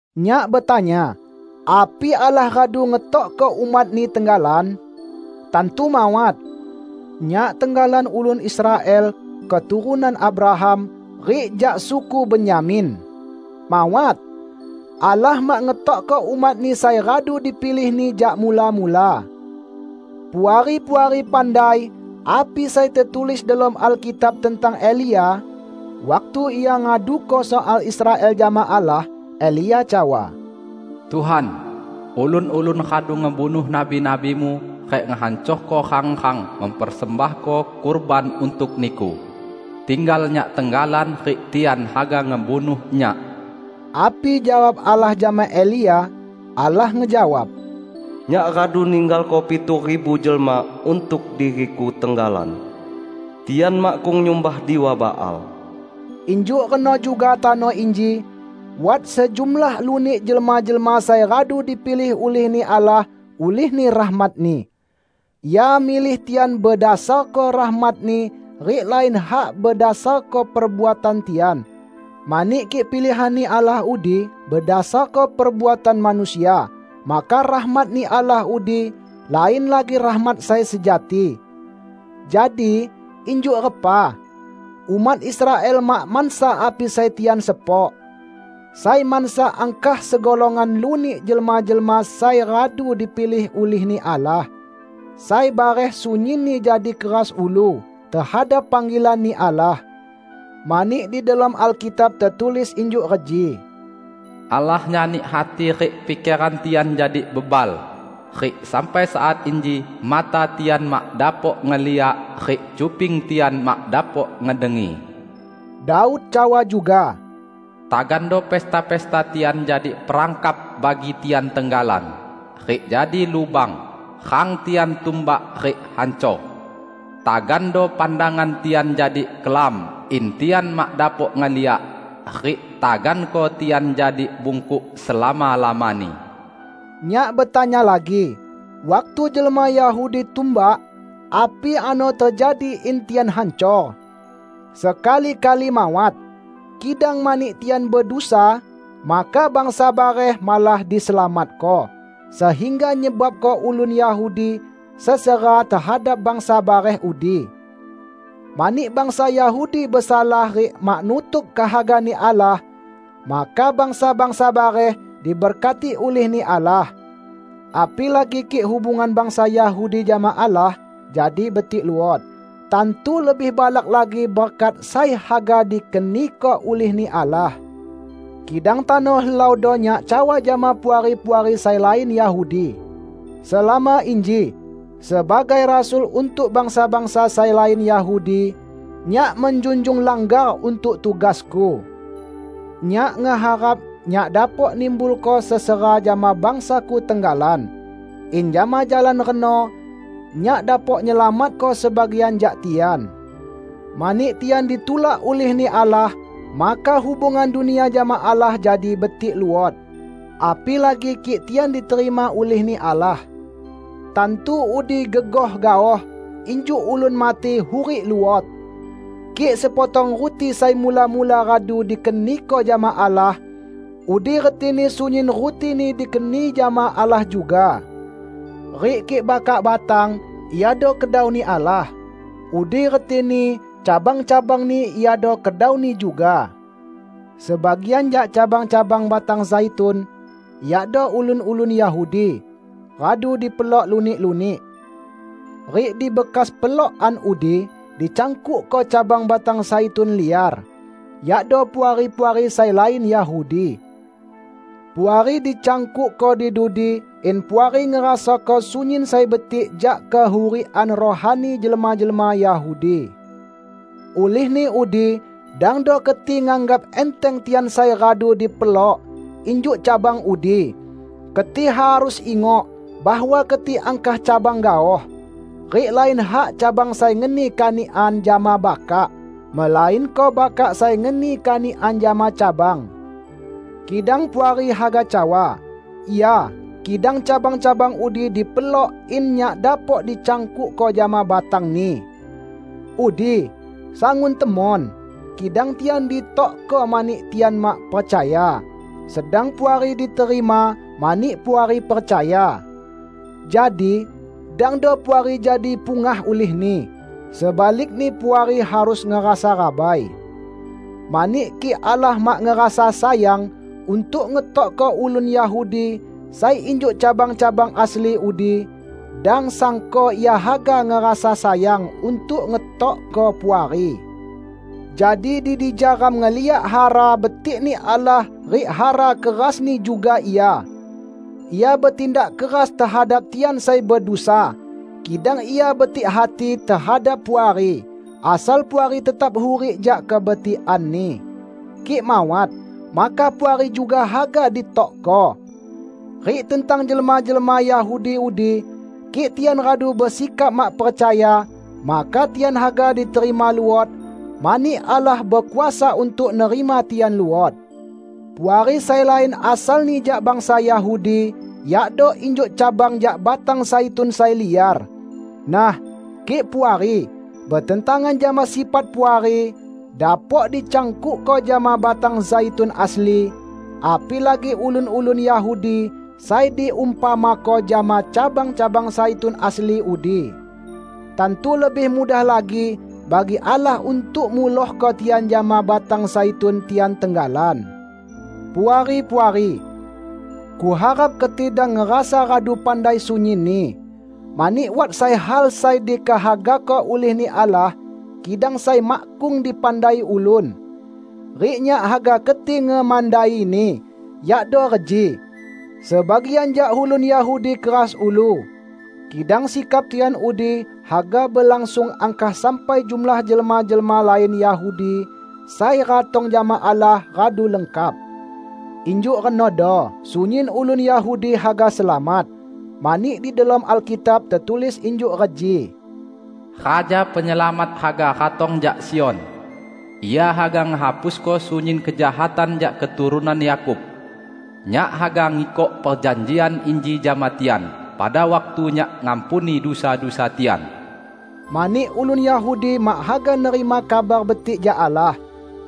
Nyak betanya: Api Allah radu ngetokko umat-Ni tenggalan? Tantu mawat! Nyak tenggalan ulun Israel keturunan Abraham, rik jak suku Benyamin. Mawat! Allah mak ngetokko umat-Ni sai radu dipilih-Ni jak mula-mula. Puari-puari pandai api sai tetulis delom Alkitab tentang Elia, waktu ia ngaduko soal Israel jama Allah. Elia cawa, "Tuhan, ulun-ulun radu ngebunuh nabi-nabi-Mu rik ngehancorko rang-rang mempersembahko kurban untuk Niku. Tinggal nyak tenggalan rik tian haga ngebunuh nyak." Api jawab Allah jama Elia? Allah ngejawab, "Nyak radu ninggalko pitu ribu jelma untuk diri-Ku tenggalan. Tian makkung nyumbah Diwa Baal." Injuk reno juga tano inji: Wat sejumlah lunik jelma-jelma sai radu dipilih ulih-Ni Allah ulihni rahmat-Ni. Ia milih tian bedasarko rahmat-Ni rik lain hak bedasarko perbuatan tian. Mani kik pilihan-Ni Allah udi bedasarko perbuatan manusia, maka rahmat-Ni Allah udi lain lagi rahmat sai sejati. Jadi, injuk repa? Umat Israel mak mansa api sai tian sepok. Sai mansa angkah segolongan lunik jelma-jelma sai radu dipilih ulih-Ni Allah. Sai bareh sunyinni jadi keras ulu tehadap panggilan-Ni Allah. Mani di delom Alkitab tetulis injuk reji, "Allah nyani hati rik pikeran tian jadi bebal; rik sampai saat inji mata tian mak dapok ngeliak rik cuping tian mak dapok ngedengi." Daud cawa juga, "Tagando pesta-pesta tian jadi perangkap bagi tian tenggalan, rik jadi lubang, rang tian tumbak rik hancor! Tagando pandangan tian jadi kelam in tian mak dapok ngeliak; rik taganko tian jadi bungkuk selama-lamani." Nyak betanya lagi: Waktu jelma Yahudi tumbak, api ano tejadi in tian hancor? Sekali-kali mawat! Kidang mani tian bedusa, maka bangsa bareh malah diselamatko, sehingga nyebabko ulun Yahudi sesera tehadap bangsa bareh udi. Mani bangsa Yahudi besalah rik mak nutuk kehaga-Ni Allah, maka bangsa-bangsa bareh diberkati ulih-Ni Allah. Apilagi kik hubungan bangsa Yahudi jama Allah jadi betik luot; tantu lebih balak lagi berkat sai haga dikeniko ulih-Ni Allah! Kidang tano helaudo nyak cawa jama Puari-puari sai lain Yahudi! Selama inji, sebagai rasul untuk bangsa-bangsa sai lain Yahudi, nyak menjunjung langgar untuk tugasku. Nyak ngeharap nyak dapok nimbulko sesera jama bangsaku tenggalan, in jama jalan reno nyak dapok nyelamatko sebagian jak tian. Mani tian ditulak ulih-Ni Allah, maka hubungan dunia jama Allah jadi betik luot; apilagi kik tian diterima ulih-Ni Allah! Tantu udi gegoh gaoh injuk ulun mati hurik luot! Kik sepotong ruti sai mula-mula radu dikeniko jama Allah, udi retini sunyin rutini dikeni jama Allah juga. Rik kik bakak batang iado kedau-Ni Allah, udi retini cabang-cabangni iado kedau-Ni juga. Sebagian jak cabang-cabang batang zaitun -- yakdo ulun-ulun Yahudi -- radu dipelok lunik-lunik. Rik di bekas pelokan udi dicangkukko cabang batang zaitun liar, yakdo Puari-puari sai lain Yahudi. Puari dicangkukko di dudi in Puari ngerasako sunyin sai betik jak kehurikan rohani jelma-jelma Yahudi. Ulihni udi dangdo keti nganggap enteng tian sai radu dipelok injuk cabang udi. Keti harus ingok bahwa keti angkah cabang gaoh. Rik lain hak cabang sai ngeni kanikan jama bakak, melainko bakak sai ngeni kanikan jama cabang. Kidang Puari haga cawa, "Ya, kidang cabang-cabang udi dipelok in nyak dapok dicangkukko jama batangni!" Udi, sangun temon. Kidang tian ditokko mani tian mak percaya, sedang Puari diterima mani Puari percaya. Jadi dangdo Puari jadi pungah ulihni; sebalikni Puari harus ngerasa rabai. Mani kik Allah mak ngerasa sayang untuk ngetokko ulun Yahudi sai injuk cabang-cabang asli udi, dang sangko Ia haga ngerasa sayang untuk ngetokko Puari! Jadi di dija ram ngeliak hara betikni Allah rik hara kerasni juga Ia. Ia betindak keras tehadap tian sai bedusa, kidang Ia betik hati tehadap Puari -- asal Puari tetap hurik jak kebetikan-Ni. Kik mawat, maka Puari juga haga ditokko. Rik tentang jelma-jelma Yahudi udi, kik tian radu besikap mak percaya, maka tian haga diterima luot; mani Allah bekuasa untuk nerima tian luot. Puari sai lain asalni jak bangsa Yahudi yakdo injuk cabang jak batang zaitun sai liar. Nah, kik Puari, betentangan jama sifat Puari, dapok dicangkukko jama batang zaitun asli, apilagi ulun-ulun Yahudi sai diumpamako jama cabang-cabang zaitun asli udi. Tantu lebih mudah lagi bagi Allah untuk mulohko tian jama batang zaitun tian tenggalan. Puari-puari! Kuharap keti dang ngerasa radu pandai sunyinni. Mani wat sai hal sai dikehagako ulih-Ni Allah, kidang sai makkung dipandai ulun. Rik nyak haga keti ngemandaini; yakdo reji: Sebagian jak ulun Yahudi keras ulu, kidang sikap tian udi haga belangsung angkah sampai jumlah jelma-jelma lain Yahudi sai ratong jama Allah radu lengkap. Injuk renodo sunyin ulun Yahudi haga selamat. Mani di delom Alkitab tetulis injuk reji, "Raja Penyelamat haga ratong jak Sion; Ia haga ngehapusko sunyin kejahatan jak keturunan Yakub. Nyak haga ngikok perjanjian inji jama tian pada waktu Nyak ngampuni dusa-dusa tian." Mani ulun Yahudi mak haga nerima Kabar Betik jak Allah,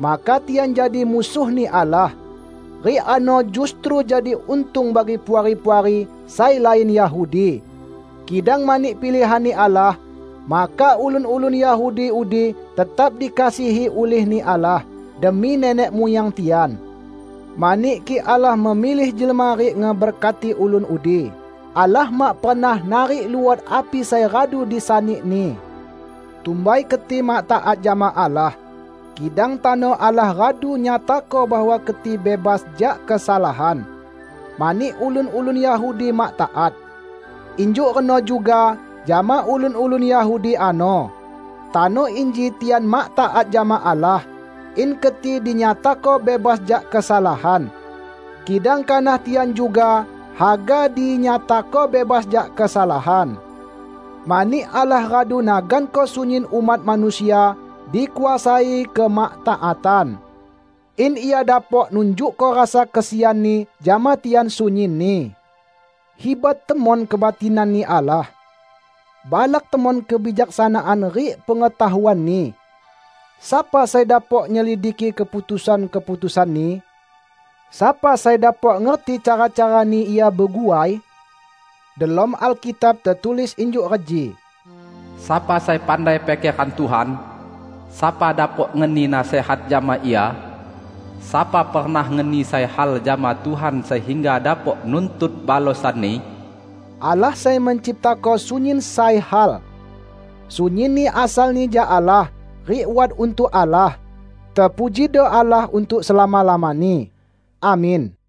maka tian jadi musuh-Ni Allah; rik ano justru jadi untung bagi Puari-puari sai lain Yahudi. Kidang mani pilihan-Ni Allah, maka ulun-ulun Yahudi udi tetap dikasihi ulih-Ni Allah demi nenek muyang tian. Mani kik Allah memilih jelma rik ngeberkati ulun udi, Allah mak pernah narik luot api sai radu disani-Ni. Tumbai keti mak taat jama Allah. Kidang tano Allah radu nyatako bahwa keti bebas jak kesalahan, mani ulun-ulun Yahudi mak taat. Injuk reno juga jama ulun-ulun Yahudi ano. Tano inji tian mak taat jama Allah, in keti dinyatako bebas jak kesalahan. Kidang kanah tian juga haga dinyatako bebas jak kesalahan. Mani Allah radu naganko sunyin umat manusia dikuasai kemaktaatan; in Ia dapok nunjukko rasa kesian-Ni jama tian sunyinni. Hibat temon kebatinan-Ni Allah! Balak temon kebijaksanaan rik pengetahuan-Ni! Sapa sai dapok nyelidiki keputusan-keputusan-Ni? Sapa sai dapok ngerti cara-cara-Ni Ia beguai? Delom Alkitab tetulis injuk reji, "Sapa sai pandai pikeran Tuhan? Sapa dapok ngeni nasihat jama Ia? Sapa pernah ngeni sai hal jama Tuhan sehingga dapok nuntut balosan-Ni?" Allah sai menciptako sunyin sai hal. Sunyinni asalni jak Allah rik wat untuk Allah. Tepujido Allah untuk selama-lamani! Amin.